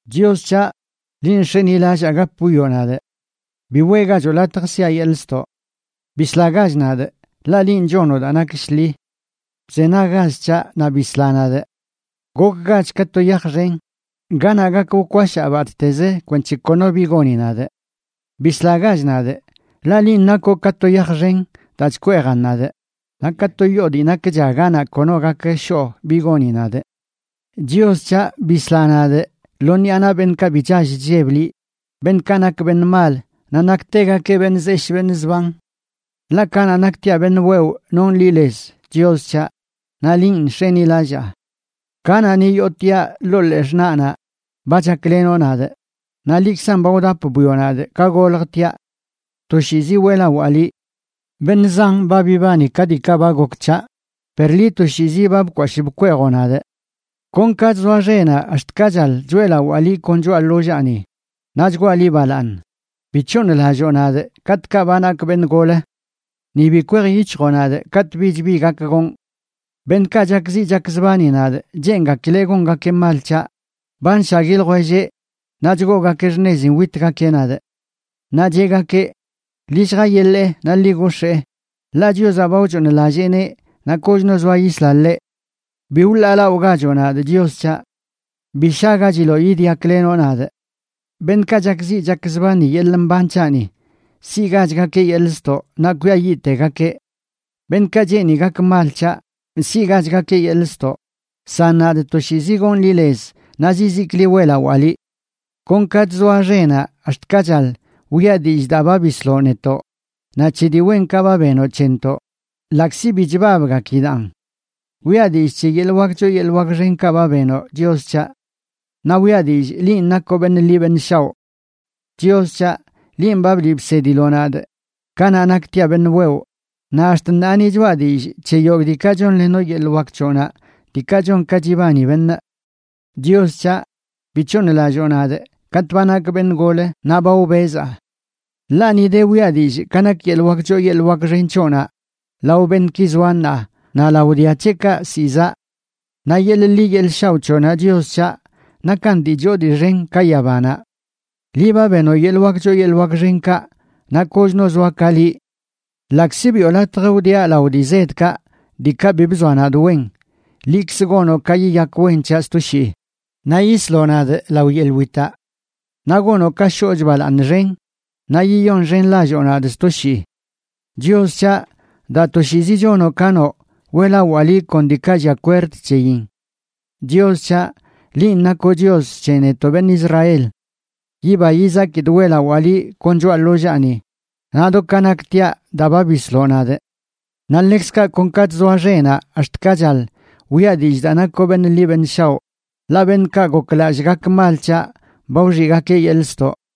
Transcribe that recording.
Chios c̱haꞌ, linꞌ nx̱enilallaa gap wwioꞌ nadꞌ; bi weꞌgacho latj sia yeḻꞌ ztoꞌ. Bislagach nadꞌ, ḻaꞌ linꞌ chonoꞌ daa nak shḻi. Bzenaggach c̱haꞌ naꞌ bisla nadꞌ. Gokgach ka to yaj xen ganaꞌ gak wkwashaa batꞌtez kwenc̱he kono bi goni nadꞌ. Bislagach nadꞌ, ḻaꞌ linꞌ nakoꞌ ka to yaj xen daa chkweejan nadꞌ, naꞌ ka to yoo dii nak cha ganaꞌ kono gak shoꞌ bi goni nadꞌ. Chios c̱haꞌ, bisla nadꞌ lo ṉiꞌa naꞌ beṉꞌkaꞌ bi chall chlleb liꞌ, beṉꞌkaꞌ nak beṉꞌ mal, naꞌ naktegakeꞌ beṉꞌ zeshꞌ beṉꞌ zban. Ḻaꞌ kanaꞌ naktiaꞌ beṉꞌ wewꞌ nonꞌ liꞌ lez, Chios c̱haꞌ, naꞌ linꞌ nx̱enilallaa. Kanaꞌ ni yootiaꞌ ḻoo ḻee xṉaꞌnaꞌ, ba chaklenoꞌ nadꞌ, naꞌ liꞌkzan ba wdap bwioꞌ nadꞌ ka goljtiaꞌ. Toshiizi weꞌlawaa liꞌ. Beṉꞌ zan ba bibani ka diikaꞌ ba gok c̱haꞌ, per liꞌ, toshiizi ba bkwashꞌ bkweejoꞌ nadꞌ. Kon ka chzoa xenaꞌ ax̱t ka chaḻ, choeꞌlawaa liꞌ kon choꞌa ḻollaani, naꞌ chgwaa liꞌ balaaṉ. Bi c̱hooṉlalloo nadꞌ katꞌkaꞌ ba nakꞌ beṉ gol; ni bi kwej yic̱hjoꞌ nadꞌ katꞌ bich bi gak gonꞌ. Beṉꞌkaꞌ chakziꞌ chakzbani nadꞌ, cheengakileꞌ gongakeꞌ mal c̱haꞌ, ba nshagui ljwelleꞌ naꞌ chgoogakeꞌ xṉezin witgakeꞌ nadꞌ. Naꞌ cheꞌgakeꞌ: “Ḻi lljayeḻeꞌ naꞌ ḻi gox̱ee, ḻaꞌ Chiozaꞌ ba wchooṉlalleeneꞌ naꞌ kochno zoa yisla ḻeꞌ.” ¡Bi wḻaalaꞌogachoꞌ nadꞌ, Chios c̱haꞌ; bi shagachiloꞌ yidyaklenoꞌ nadꞌ! ¡Beṉꞌkaꞌ chakziꞌ chakzbani yeḻꞌ mban c̱haꞌni siꞌgachꞌgakeꞌ yeḻꞌ ztoꞌ naꞌ kwiayiꞌtegakeꞌ! ¡Beṉꞌkaꞌ cheeni gak mal c̱haꞌ, siꞌgachgakeꞌ yeḻꞌ ztoꞌ! San nadꞌ toshiizi gon liꞌ lez naꞌ zizikliꞌ weꞌlawaa liꞌ. Kon ka chzoa xenaꞌ ax̱t ka chaḻ, wiꞌa dillꞌ daa ba bisloꞌ netoꞌ, naꞌ c̱he dii wenkaꞌ ba benoꞌ c̱hentoꞌ, ḻaꞌkzi bi chbabgakidaꞌn. Wiꞌa dillꞌ c̱he yeḻꞌ wak choo yeḻꞌ wak xenkaꞌ ba benoꞌ, Chios c̱haꞌ; naꞌ wiꞌa dillꞌ linꞌ nakoꞌ beṉꞌ ḻi beṉꞌ shaoꞌ. Chios c̱haꞌ, linꞌ ba bliꞌ bsediloꞌ nadꞌ kanaꞌ naktiaꞌ beṉꞌ wewꞌ, naꞌ ax̱t ṉaa ni choꞌa dillꞌ c̱he yogꞌ diikaꞌ chonlenoꞌ yeḻꞌ wak c̱hoꞌnaꞌ diikaꞌ chon ka chibani beṉꞌ. Chios c̱haꞌ, bi c̱hooṉlalloo nadꞌ katꞌ ba nakꞌ beṉꞌ gol naꞌ ba wbezaa. Ḻaꞌ ni de wiꞌa dillꞌ ka nak yeḻꞌ wak choo yeḻꞌ wak xen c̱hoꞌnaꞌ lao beṉꞌki zoa ṉaa naꞌ lao dia c̱heꞌkaꞌ ziꞌ zaꞌ. Naꞌ yeḻꞌ ḻi yeḻꞌ shaoꞌ c̱hoꞌnaꞌ, Chios c̱haꞌ, nakan dii choo dii xen ka yabanaꞌ. Liꞌ ba benoꞌ yeḻꞌ wak choo yeḻꞌ wak xenkaꞌ, naꞌ koch no zoa ka liꞌ. Ḻaꞌkzi biꞌo latj wdiaꞌ lao dii zedkaꞌ diikaꞌ bi bzoa nadꞌ wen, liꞌkz gonoꞌ ka yiyak wen c̱haꞌ sto shii, naꞌ yisloꞌ nadꞌ lao yeḻꞌ witaꞌ. Naꞌ gonoꞌ ka shoochꞌ balaaṉ xen naꞌ yiyonxenlalloo nadꞌ sto shii. Chios c̱haꞌ, daa toshiizi chonoꞌ ka noꞌ, weꞌlawaaꞌ liꞌ kon diikaꞌ llia kwerd c̱heyin. Chios c̱haꞌ, linꞌ nakoꞌ Chios c̱he netoꞌ beṉꞌ Israel. Yiba yizakidꞌ weꞌlawaa liꞌ kon choꞌa ḻollaani naꞌ do ka naktiaꞌ, daa ba bisloꞌ nadꞌ. Naꞌ ḻekzkaꞌ kon ka chzoa xenaꞌ ax̱t ka chaḻ, wiꞌa dillꞌ daa nakoꞌ beṉꞌ ḻi beṉꞌ shaoꞌ, ḻaꞌ beṉꞌkaꞌ goklallꞌ gak mal c̱haꞌ ba wxiꞌgakeꞌ yeḻꞌ ztoꞌ.